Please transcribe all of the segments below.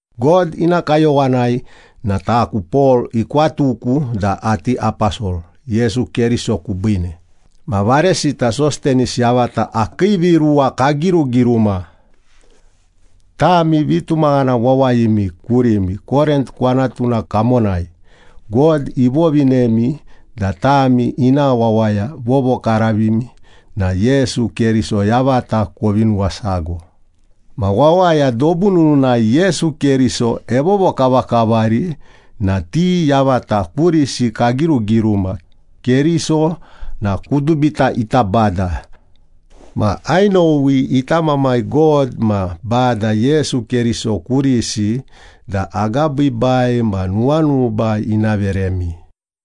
God ina kayowanai na taku, Pol ikwatuku da ati aposol Yesu Keriso kubiine, ma varesita Sostenis yavata akii viruwa kagirugiruma. Tami vitumaghana wawayimi kurimi Korint kwanatuna kamonai. God ivovinemi da tami ina wawaya vovokaravimi na Yesu Keriso yavata kovi nuwasago. Ma wawaya dobu nununai Yesu Keriso evovokavakavari na ti yavata kurisi kagirugiruma. Keriso na kudubita ita Bada. Ma ainowi ita Mamai God ma Bada Yesu Keriso kurisi da agabiibai ma nuwanuba ina veremi.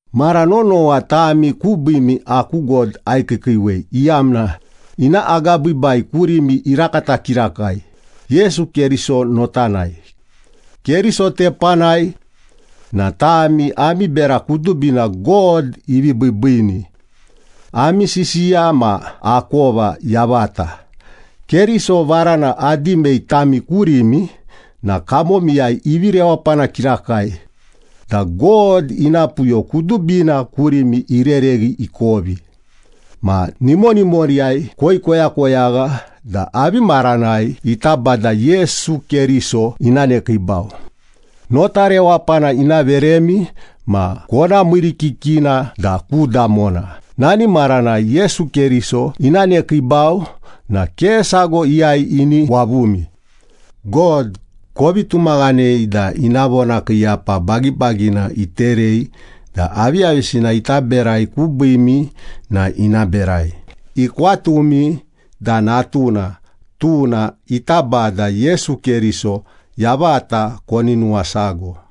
Mara nonowa tami kubiimi aku God aikiikiiwei, iyamna ina agabiibai kurimi irakata kirakai Yesu Keriso notanai. Keriso tepanai na tami ami bera kudubina God ivi biibiini, ami sisiya ma akova yavata. Keriso varana adimei tami kurimi na kamomiyai ivi rewapana kirakai, da God ina puyo kudubina kurimi irereghi ikovi. Ma nimonimoriyai koikoyakoyagha da avi maranai ita Bada Yesu Keriso ina nekiibau. Nota rewapana ina veremi ma kona miirikikina da ku damona, nani maranai Yesu Keriso ina nekiibau na ke sago iyai ini wavumi. God kovi tumaghanei da ina vonakiiyapa bagibagina iterei da aviyavisina ita berai kubiimi na ina berai. Ikwatumi da Natuna, tuna ita Bada Yesu Keriso yavata koni nuwasago.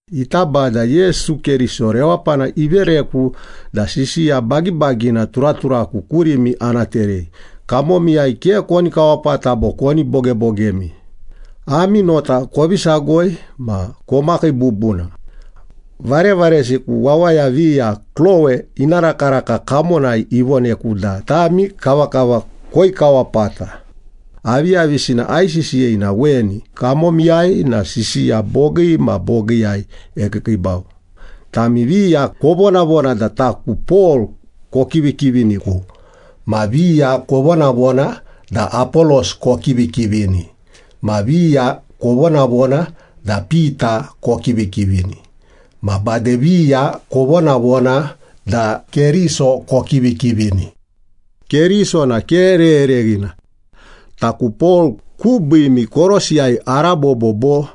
Ita Bada Yesu Keriso rewapana ivereku da sisiya bagibagina turaturaku kurimi ana terei. Kamomiyai ke koni kawapata bo koni bogebogemi. Ami nota kovi sagoi ma komakii bubuna. Varevaresiku, wawaya viya Klowe ina rakaraka kamonai ivoneku da tami kavakava koikawapata. Aviyavisina aisisiyei na weni, kamomiyai na sisiya bogii ma bogiiyai ekiikiibau. Tami viya kovonavona da taku Pol kokivikiviniku, ma viya kovonavona da Apolos kokivikivini, ma viya kovonavona da Pita kokivikivini, ma bade viya kovonavona da Keriso kokivikivini. Keriso na ke rerereghina. Taku Pol kubiimi korosiyai arabobo bo?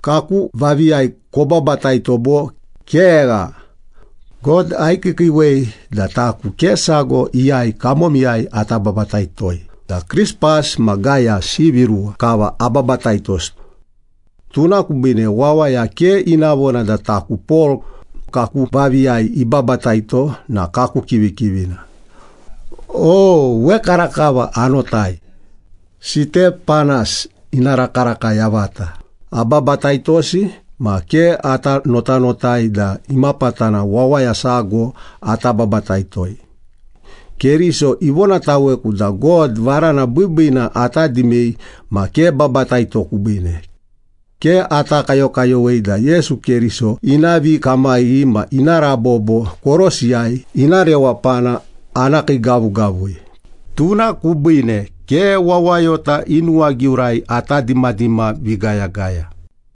Kaku vaviiyai kobabataito bo? Kegha! God aikiikiiwei da taku ke sago iyai kamomiyai ata babataitoi, da Krispas ma Gayas ivi ruwa kava ababataitosi. Tuna kubiine wawaya ke ina vona da taku Pol, kaku vaviiyai ibabataito na kaku kivikivina. (O, wekarakava anotai, Sitepanas ina rakaraka yavata ababataitosi ma ke ata notanotai da imapatana wawaya sago ata babataito.) Keriso ivonataweku da God varana biibiina ata dimei ma ke babataito kubiine. Ke ata kayokayowei da Yesu Keriso ina vikamaghi ma ina rabobo korosiyai ina rewapana ana kiigavugavui, tuna kubiine ke wawayota i nuwagiurai ata dimadima vigayagaya.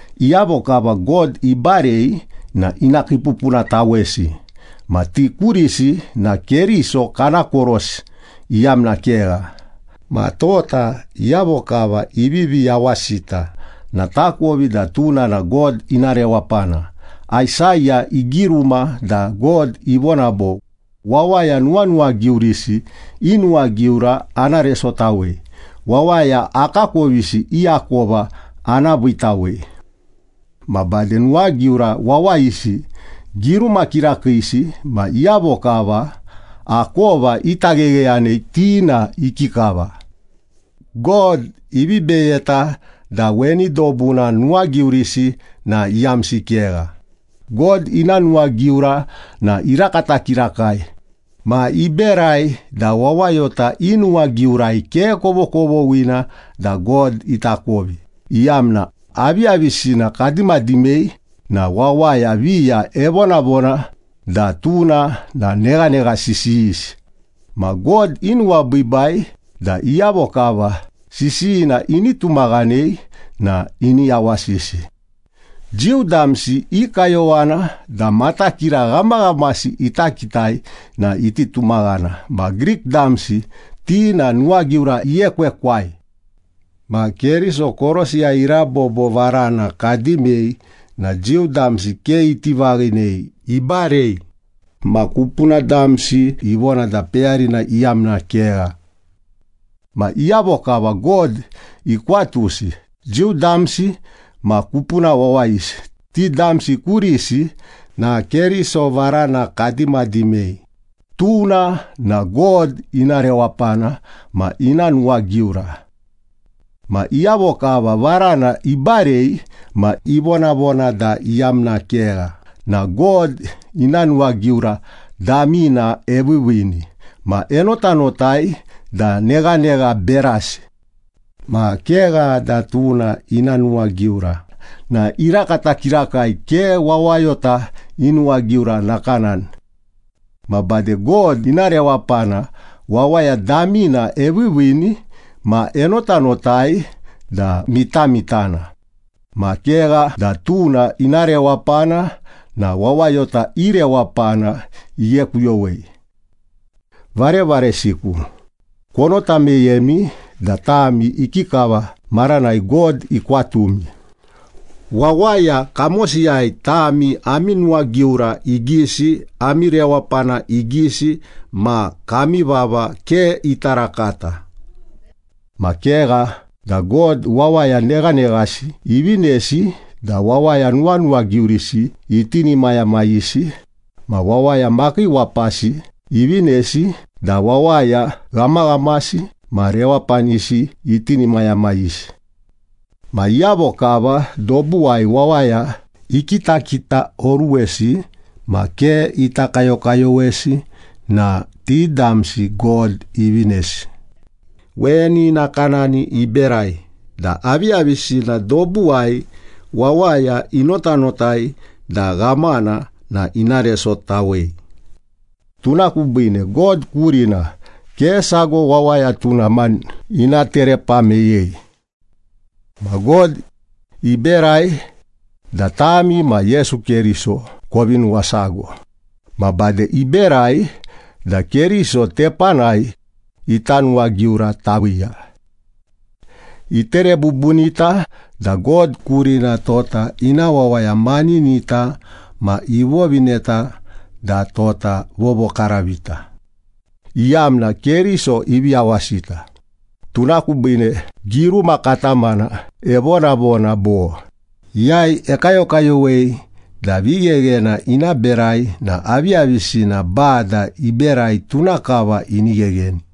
Iyavo kava God ibarei na ina kiipupunatawesi. Ma ti kurisi na Keriso kana korosi iyamna kegha. Ma tota iyavo kava ivivi yawasita na takovi da tuna na God ina rewapana. Aisaya igiruma da God ivona bo, “Wawaya nuwanuwagiurisi i nuwagiura ana resotawei. Wawaya akakovisi i akova ana viitawei.” Ma bade nuwagiura wawayisi, giruma kirakiisi ma iyavo kava akova ita ghegheyanei, ti na ikikava? God ivi beyeta da weni dobuna nuwagiurisi na iyamsi kegha. God ina nuwagiura na irakata kirakai. Ma iberai da wawayota i nuwagiurai ke kovokovoghina da God itakovi, iyamna, aviyavisina kadimadimei na wawaya viya evonavona da tuna na neghanegha sisiyisi. Ma God inuwabiibai da iyavo kava sisiyina ini tumaghanei na ini yawasisi. Jiu damsi i kayowana da matakira ghamaghamasi ita kitai na iti tumaghana ma Grik damsi ti na nuwagiura iekwekwai. Ma Keriso korosiyai irabobo varana kadimei na Jiu damsi ke iti vaghinei, ibarei. Ma kupuna damsi ivona da peyarina iyamna kegha. Ma iyavo kava God ikwatusi, Jiu damsi ma kupuna wawayisi, ti damsi kurisi na Keriso varana kadimadimei. Tuna na God ina rewapana ma ina nuwagiura. Ma iyavo kava varana ibarei ma ivonavona da iyamna kegha na God ina nuwagiura damina eviiviini ma enotanotai da neghanegha berasi. Ma kegha da tuna ina nuwagiura na irakata kirakai ke wawayota i nuwagiura nakanani. Ma bade God ina rewapana wawaya damina eviiviini ma enotanotai da mitamitana. Ma kegha da tuna ina rewapana na wawayota i rewapana ighekuyowei. Varevaresiku, konota meyemi da tami ikikava maranai God ikwatumi. Wawaya kamosiyai tami ami nuwagiura igisi, ami rewapana igisi, ma kami vava ke ita rakata. Ma kegha da God wawaya neghaneghasi ivinesi da wawaya nuwanuwagiurisi itinimayamayisi ma wawaya makiiwapasi ivinesi da wawaya ghamaghamasi ma rewapanisi itinimayamayisi. Ma iyavo kava dobuwai wawaya ikitakitaoruwesi ma ke ita kayokayowesi na ti damsi God ivinesi. Weni nakanani iberai da aviyavisina dobuwai wawaya inotanotai da ghamana na ina resotawei, tuna kubiine God kurina ke sago wawaya tuna mani ina terepa meyei. Ma God iberai da tami ma Yesu Keriso kovi nuwasago. Ma bade iberai da Keriso tepanai ita nuwagiura taviiya. Itere bubunita da God kurina tota ina wawaya maninita ma ivovineta da tota vovokaravita, iyamna Keriso ivi yawasita. Tuna kubiine giruma katamana evonavona bo, “Iyai ekayokayowei da vigheghena ina berai na aviyavisina Bada iberai, tuna kava ini ghegheni.”